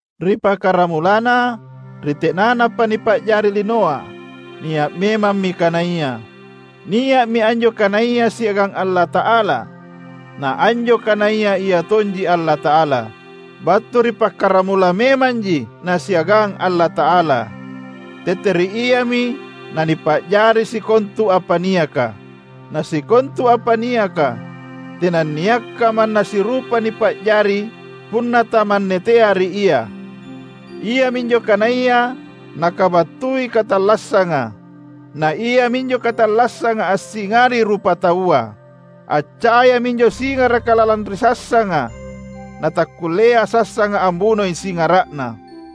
Ri pakaramulana, ri tenanapa nipa’jari linoa, nia’ memammi Kanaya. Nia’mi anjo Kanaya siagang Allata’ala na anjo Kanaya iatonji Allata’ala. Battu ri pakkaramula memanji nasiagang Allata’ala. Tete ri Iami nanipa’jari sikontu apa niaka, na sikontu apa niaka, tenanniakka manna sirupa nipa’jari punna tamannetea ri Ia. Iaminjo Kanaya nakabattui katallassanga, na iaminjo katallassanga assingari rupataua. Accaya minjo Singaraka lalang ri sassanga, na takkullea sassanga ambunoi Singara’Na.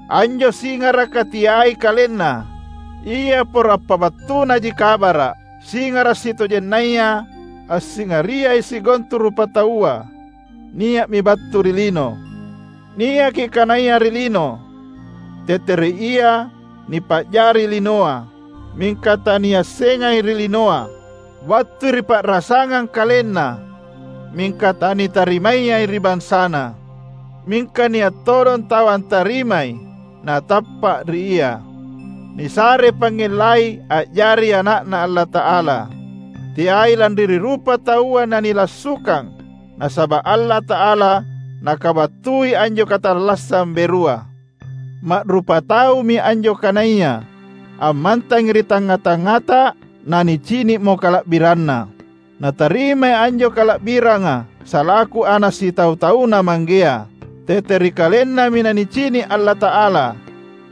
Anjo singaraka teai kalenna, ia poro appabattunaji kabara’. Singara’ sitojennaya, assingariai sikontu rupataua, nia’mi battu ri lino. Niaki Kanaya ri lino, tete ri Ia nipa’jari linoa, mingka taniassengai ri linoa. Battui ri pa’rasangang KalenNa mingka tanitarimayai ri bansaNa. Mingka nia’ todong tau antarimai na tappa’ ri Ia, nisarei pangngellai a’jari ana’Na Allata’ala, teai lanri ri rupataua nanilassukang, nasaba’ Allata’ala nakabattui anjo katallassang berua. Ma’rupataumi anjo Kanaya, ammantangi ri tangnga-tangngata, na nicini’mo kala’biranNa. Natarimai anjo kala’biranga salaku Ana’ sitau-tauNa Manggea. Tete ri KalenNami nanicini’ Allata’ala,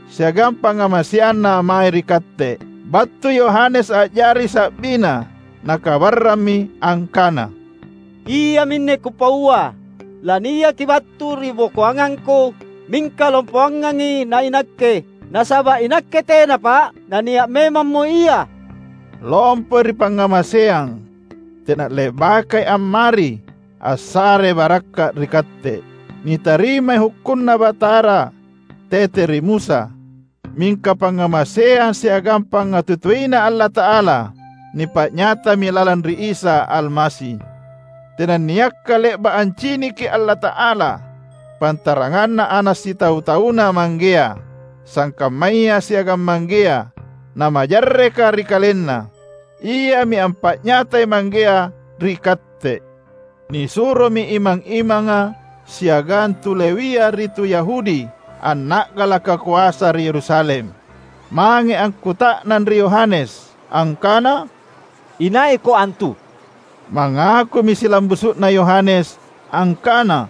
siagang pangngamaseanNa mae ri katte. Battui Yohanes a’jari sa’biNa, nakabarrammi angkana: "Iaminne kupaua: Laniaki battu ri bokoangangku, mingka lompoangangi nainakke, nasaba’ inakke tenapa’, nania’ memammo Ia." Lompoi ri pangngamaseang; tena le’bakai ammari, assare barakka’ ri katte. Nitarimai HukkunNa Batara, tete ri Musa. Mingka pangngamaseang siagang pangngatutuiNa Allata’ala nipa’nyatami lalang ri Isa Almasi. Tenanniakka le’ba’ anciniki Allata’ala, pantaranganna Ana’ sitau-tauNa Manggea, sangkammaya siagang Manggea, na majarreka ri KalenNa. Iami ampa’nyatai Manggea ri Katte. Nisuromi imang-imanga siagang tu Lewia ri tu Yahudi anna’galaka koasa ri Yerusalem, mange akkuta’nang ri Yohanes, angkana, "Inaiko antu?" Mangakumi silambusu’na Yohanes angkana,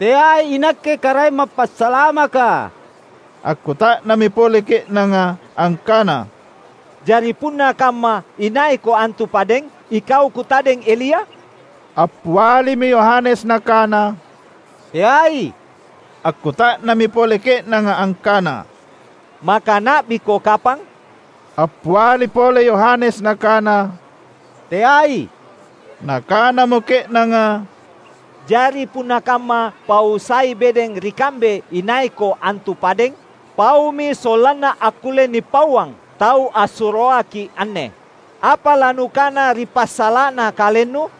"Teai inakke Karaeng Mappasalamaka." Akkuta’nammi pole ke’nanga angkana, "Jari punna kamma, inaiko antu padeng? Ikau kutadeng Elia?" Appialimi Yohanes nakana, "Teai." Akkuta’nammi pole ke’nanga angkana, "Maka Na’biko kapang?" Appialimi pole Yohanes nakana, "Teai." Nakanamo ke’nanga, "Jari punna kamma, pau sai bedeng ri kambe inaiko antu padeng? Paumi sollanna akkulle nipauang tau assuroaki’ anne. Apa lanukana ri passala’na kalennu?"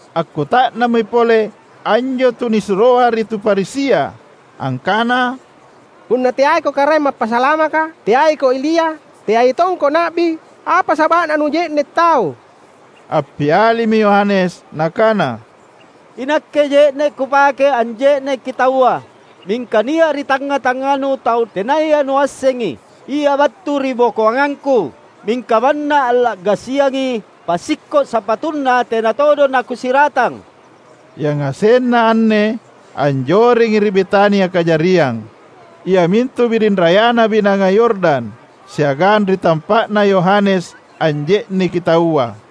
Akkuta’nammi pole anjo tunisuroa ri tu Farisia, angkana, "Punna teaiko Karaeng Mappasalamaka, teaiko Elia, teai tongko Na’bi, apa saba’na nuje’ne’ tau?" Appialimi Yohanes, nakana, "Inakke je’ne’ kupake anje’neki taua. Mingka nia’ ri tangnga-tangnganu tau tenaya nuassengi. Ia battu ri bokoangangku, mingka manna alla’gasiangi passikko’ sapatuNa tena todong nakusiratang." Yangasenna anne anjorengi ri Betania kajariang, iamintu biring rayana Binanga Yordan siagang ri tampa’na Yohanes anje’neki taua.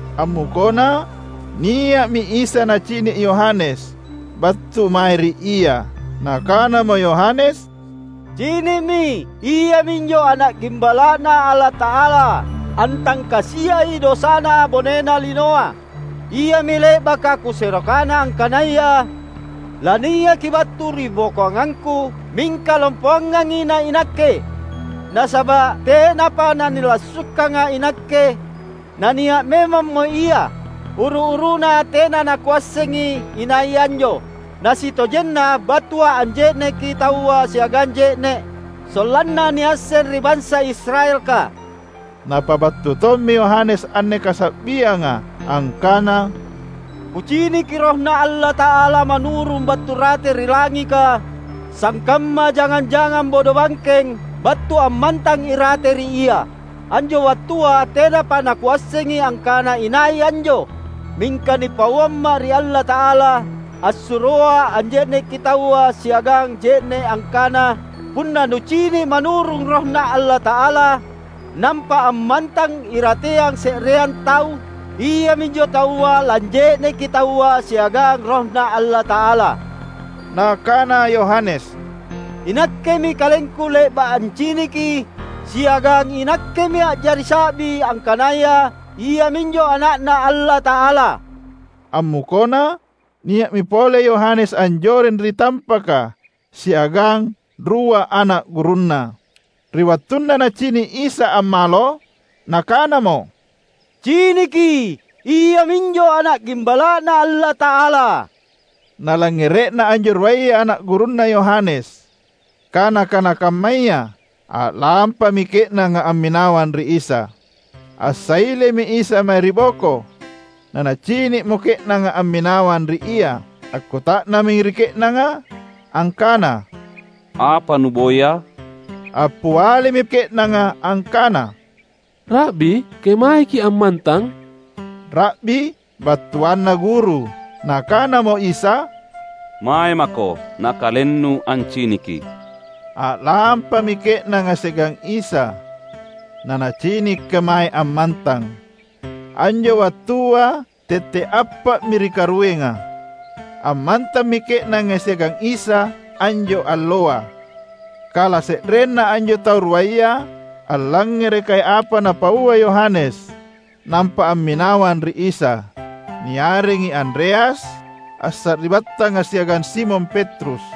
Ammukona, nia’mi Isa nacini’ Yohanes battu mae ri ia. Nakanamo Yohanes, "Cini’mi, Iaminjo Ana’ Gimbala’Na Allata’ala, antangkasiai dosana bonena linoa. Iami le’baka kusero kana angkanaya laniaki battu ribokoangangku, mingka lompoangangi nainakke. Nasaba’ tenapa nanilassukanga’ inakke, nania’ memammo Ia. Uru-uruna tena nakuassengi inai anjo. Nasitojenna battua’ anje’neki taua siagang je’ne’, sollanna niasseng ri bansa Israelka." Napabattu tommi Yohanes anne kasa’bianga angkana, "Kuciniki RohNa Allata’ala manurung battu rate ri langika, sangkamma jangang-jangang bodobangkeng, battu ammantang irate ri Ia. Anjo wattua tenapa nakuassengi angkana inai anjo. Mingka nipauamma’ ri Allata’ala assuroa’ anje’neki taua siagang je’ne’ angkana, ‘Punna nucini’ manurung RohNa Allata’ala, nampa ammantang irateang se’reang tau, Iaminjo taua lanje’neki taua siagang RohNa Allata’ala.’" Nakana Yohanes, "Inakkemi kalengku le’ba’ anciniki, siagang inakkemi a’jari sa’bi angkanaya Iaminjo Ana’Na Allata’ala." Ammukona, nia’mi pole Yohanes anjoreng ri tampaka siagang rua ana’ gurunna. Ri wattunna nacini’ Isa ammalo, nakanamo, "Ciniki! Iaminjo Ana’ Gimbala’Na Allata’ala." Nalangngere’na anjo ruaya ana’ gurunna Yohanes kana-kana kammaya, a’lampami ke’nanga amminawang ri Isa. Assailemi Isa mae ri boko, na Nacini’mo ke’nanga amminawang ri Ia. Akkuta’nammi ri ke’nanga angkana, "Apa nuboya?" Appialimi ke’nanga angkana, "Ra’bi kemaeki ammantang?" (‘Ra’bi’ battuanna guru.) Nakanamo Isa, "Mae mako nakalennu anciniki." A’lampami ke’nanga siagang Isa, na nacini’ kemae ammantang. Anjo wattua tette’ appa’mi ri karuenga. Ammantammi ke’nanga siagang Isa anjo alloa. Kala se’renna anjo tau ruaya, allangngerekai apa napaua Yohanes nampa amminawang ri Isa, niarengi Andreas, assari’battanga siagang Simon Petrus.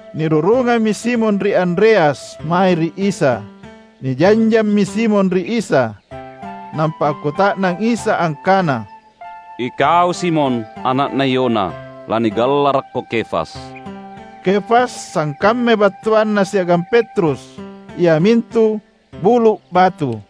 Nirurungammi Simon ri Andreas mae ri Isa. Nijanjammi Simon ri Isa, nampa akkuta’nang Isa angkana, "Ikau Simon, ana’na Yona. Lanigallarakko Kefas." (Kefas sangkammai battuanna siagang Petrus, iamintu: bulu’ batu.)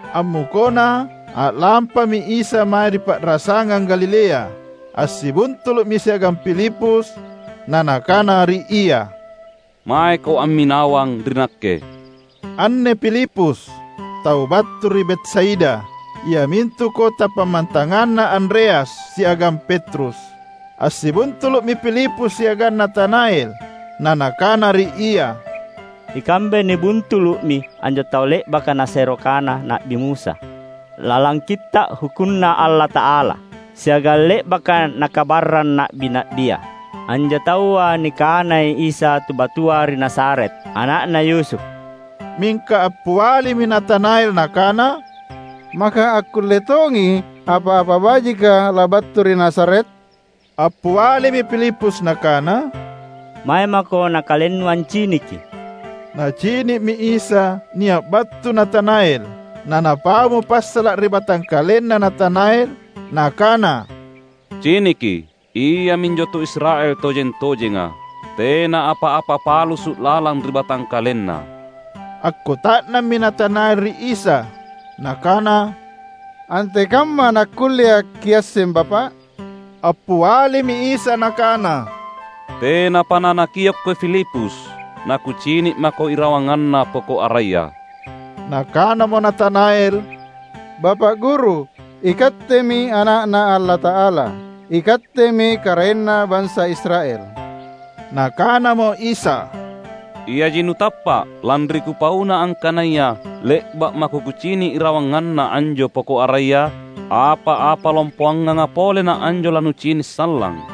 Ammukona, a’lampami Isa mange ri pa’rasangang Galilea. Assibuntulu’mi siagang Filipus, na Nakana ri ia, "Maeko amminawang ri Nakke!" Anne Filipus, tau battu ri Betsaida, iamintu kota pammantanganna Andreas siagang Petrus. Assibuntulu’mi Filipus siagang Natanael, na nakana ri ia, "Ikambe nibuntulu’mi anjo tau le’baka nasero kana Na’bi Musa lalang Kitta’ HukkunNa Allata’ala, siagang le’baka nakabarrang na’bi-na’bia. Anjo taua nikanai Isa tu battua ri Nazaret, ana’na Yusuf." Mingka appialimi Natanael nakana, "Maka akkulle tongi apa-apa bajika labattu ri Nazaret?" Appialimi Filipus nakana, "Mae mako nakalennu anciniki." Nacini’mi Isa nia’ battu Natanael; na Napaumo passala’ ri batangkalenna Natanael Nakana, "Ciniki, iaminjo tu Israel tojeng-tojenga. Tena apa-apa palassu lalang ri batangkalenna." Akkuta’nammi Natanael ri Isa, nakana, "Antekamma nakkullea’ Kiasseng Bapa’?" Appialimi Isa Nakana, "Tenapa nanakiokko Filipus, naKucini’mako irawanganna poko’ araya." Nakanamo Natanael, "Bapa’ Guru, iKattemi Ana’Na Allata’ala! IKattemi Karaenna bansa Israel!" Nakanamo Isa, "Iaji nutappa’, lanri Kupauna angkanaya le’ba’ mako Kucini’ irawanganna anjo poko’ araya? Apa-apa lompoanganga pole na anjo lanucini’ sallang!"